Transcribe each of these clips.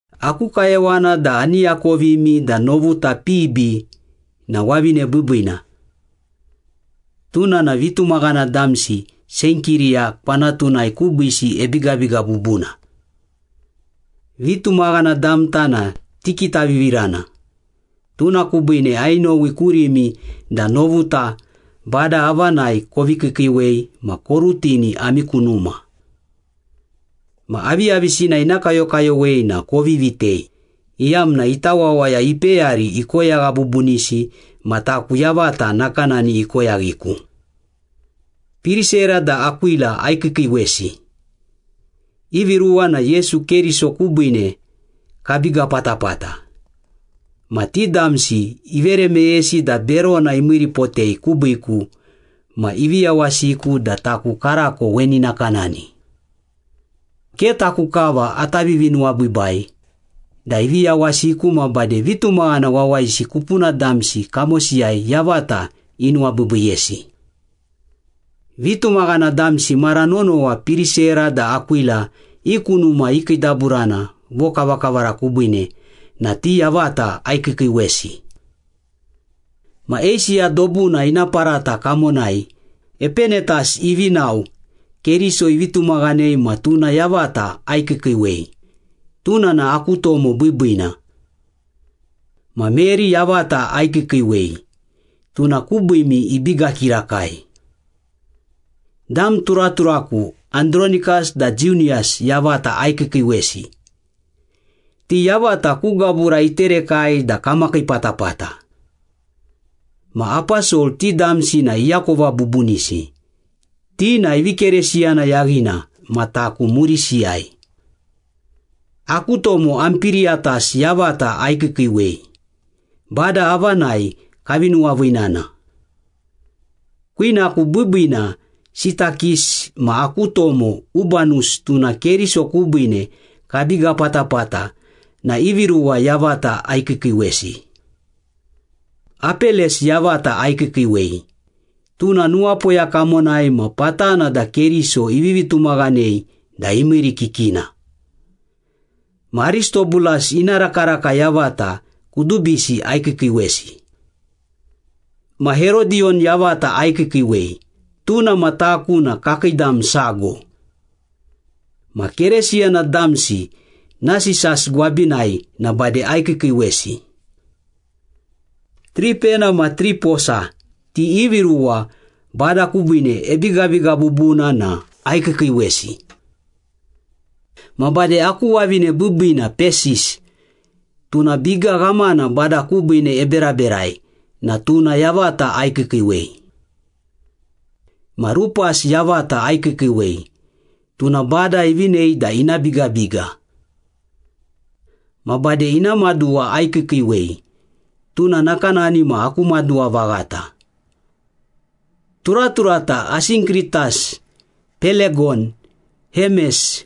Aku kayowana da ani akovimi da novuta Pibi na wavine biibiina. Tuna na vitumaghana damsi Senkiriya kwanatunai kubiisi ebigabiga bubuna. Vitumaghana damta na tikitavivirana, tuna kubiine ainowi kurimi da novuta Bada avanai kovi kiikiiwei ma korutini ami ku numa. Ma aviyavisina ina kayokayowei na kovi vitei, iyamna ita wawaya ipeyari ikoyagha bubunisi ma taku yavata nakanani ikoyaghiku. Pirisera da Akwila aikiikiiwesi. Ivi ruwa na Yesu Keriso kubiine kabiga patapata, ma ti damsi ivere meyesi da berona imiiripotei kubiiku ma ivi yawasiku da taku karako weni nakanani. Ke taku kava ata vivinuwabiibai da ivi yawasiku ma bade vitumaghana wawayisi kupuna damsi kamosiyai yavata inuwabiibiiyesi. Vitumaghana damsi mara nonowa Pirisera da Akwila i ku numa ikiidaburana vokavakavara kubiine na ti yavata aikiikiiwesi. Ma Eisiya dobuna ina parata kamonai Epenetas ivi nao Keriso ivi tumaghanei ma tuna yavata aikiikiiwei, tuna na aku tomo biibiina. Ma Meri yavata aikiikiiwei, tuna kubiimi ibiga kirakai. Dam turaturaku Andronikas da Jiuniyas yavata aikiikiiwesi. Ti yavata ku gabura iterekai da kamakii patapata. Ma aposol ti damsi na iakova bubunisi, ti na ivi Keresiyana yaghina ma taku murisiyai. Aku tomo Ampiriyatas yavata aikiikiiwei, Bada avanai kavi nuwaviinana. Kwinaku biibiina Sitakis ma aku tomo Ubanus tuna Keriso kubiine kabiga patapata na ivi ruwa yavata aikiikiiwesi. Apeles yavata aikiikiiwei, tuna nuwapoya kamonai ma patana da Keriso ivivi tumaghanei da imiirikikina. Ma Aristobulas ina rakaraka yavata kudubisi aikiikiiwesi. Ma Herodiyon yavata aikiikiiwei, tuna ma taku na kakii dam sago. Ma Keresiyana damsi Nasisas gwabinai na bade aikiikiiwesi. Tripena ma Triposa ti ivi ruwa Bada kubiine ebigabiga bubuna na aikiikiiwesi. Ma bade aku wavine biibiina Pesis, tuna biga ghamana Bada kubiine eberaberai na tuna yavata aikiikiiwei. Ma Rupas yavata aikiikiiwei, tuna Bada ivinei da ina bigabiga. Ma bade ina maduwa aikiikiiwei, tuna nakanani ma aku maduwa vaghata. Turaturata Asinkritas, Pelegon, Hemes,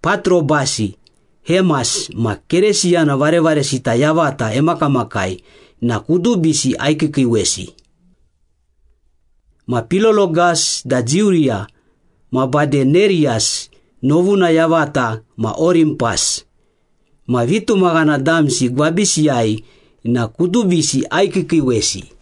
Patrobasi, Hemas ma Keresiyana varevaresita yavata emakamakai na kudubisi aikiikiiwesi. Ma Pilologas da Jiuriya ma bade Neriyas novuna yavata ma Orimpas, ma vitumaghana damsi gwabisiyai na kudubisi aikiikiiwesi.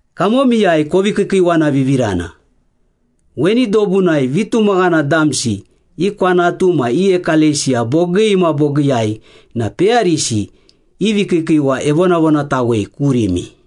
Kamomiyai kovi kiikiiwavivirana. Weni dobunai vitumaghana damsi i kwanatu ma i ekalesiya bogii ma bogiiyai na peyarisi i vikiikiiwa evonavonatawei kurimi.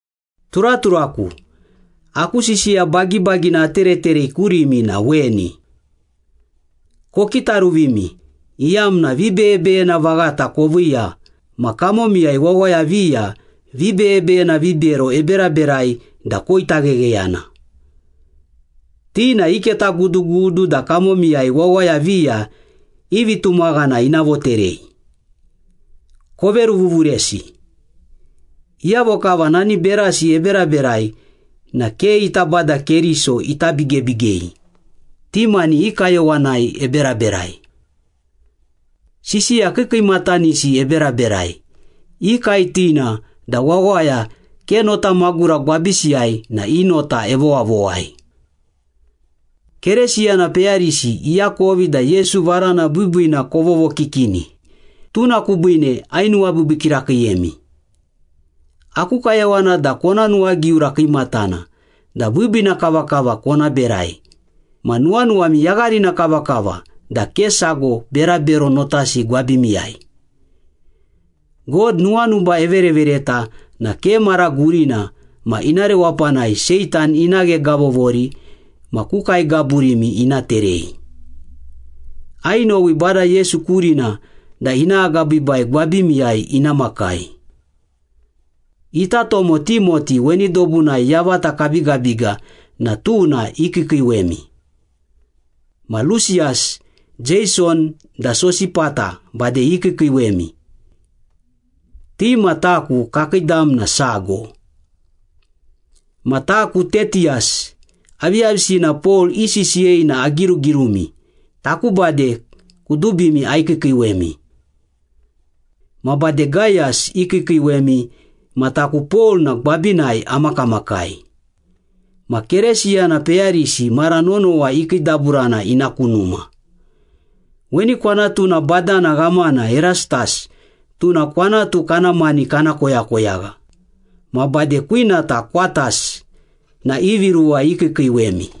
Turaturaku, aku sisiya bagibagina atereterei kurimi na weni. Kokitaruvimi, iyamna vibeyebeyena vaghata koviiya ma kamomiyai wawaya viya vibeyebeyena vibero eberaberai da koitaghegheyana. Ti na iketagudugudu da kamomiyai wawaya viya i vitumaghana ina voterei. Koveruvuvuresi. Iyavo kava nani berasi eberaberai na ke ita Bada Keriso ita bigebigei, ti mani i kayowanai eberaberai. Sisiya kiikiimatanisi eberaberai, ikaetina da wawaya ke notamagura gwabisiyai na i nota evowavowai. Kerisiyana peyarisi iakovi da Yesu varana biibiina kovovokikini, tuna kubiine ainuwabiibii kirakiiyemi. Aku kayowana da kona nuwagiura kiimatana da biibiina kavakava kona berai, ma nuwanuwami yagharina kavakava da ke sago berabero notasi gwabimiyai. God nuwanuba everevereta na ke mara gurina ma ina rewapanai Seitan ina ghegavovori ma ku kae gaburimi ina terei. Ainowi Bada Yesu kurina da ina agabiibai gwabimiyai ina makai. Ita tomo Timoti weni dobunai yavata kabigabiga na tuna ikiikiiwemi. Ma Lusiyas, Jeison, da Sosipata bade ikiikiiwemi. Ti ma taku kakii dam na sago. Ma taku Tetiyas, aviyavisina Pol isisiyei na agirugirumi, taku bade kudubimi aikiikiiwemi. Ma bade Gayas ikiikiiwemi ma taku Pol na gwabinai amakamakai. Ma Keresiyana peyarisi mara nonowa ikiidaburana ina ku numa. Weni kwanatuna badana ghamana Erastas tuna kwanatu kana mani kana koyakoyagha, ma bade kwinata Kwatas na ivi ruwa ikiikiiwemi.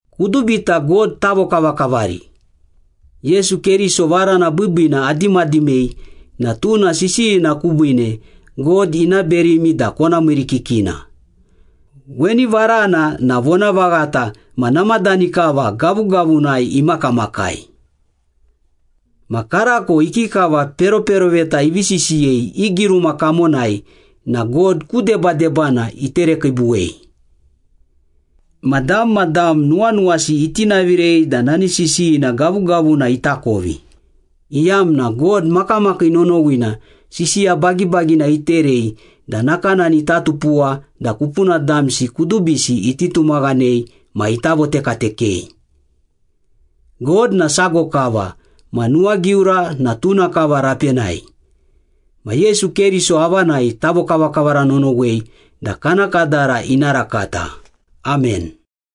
Kudubita God tavokavakavari! Yesu Keriso varana biibiina adimadimei na tuna sisiyina kubiine God ina berimi da kona miirikikina. Weni varana na vonavaghata ma namadani kava gavugavunai imakamakai. Ma karako ikikava peroperoveta ivi sisiyei i giruma kamonai na God ku debadebana iterekiibuwei. Ma dam ma dam nuwanuwasi itinavirei da nani sisiyina gavugavuna itakovi, iyamna God makamakii nonowina sisiya bagibagina iterei da nakanani ita tupuwa da kupuna damsi kudubisi iti tumaghanei ma ita votekatekei. God na sago kava ma nuwagiura na tuna kava rapenai. Ma Yesu Keriso avanai tavokavakavara nonowei da kana kadara ina rakata! Amen.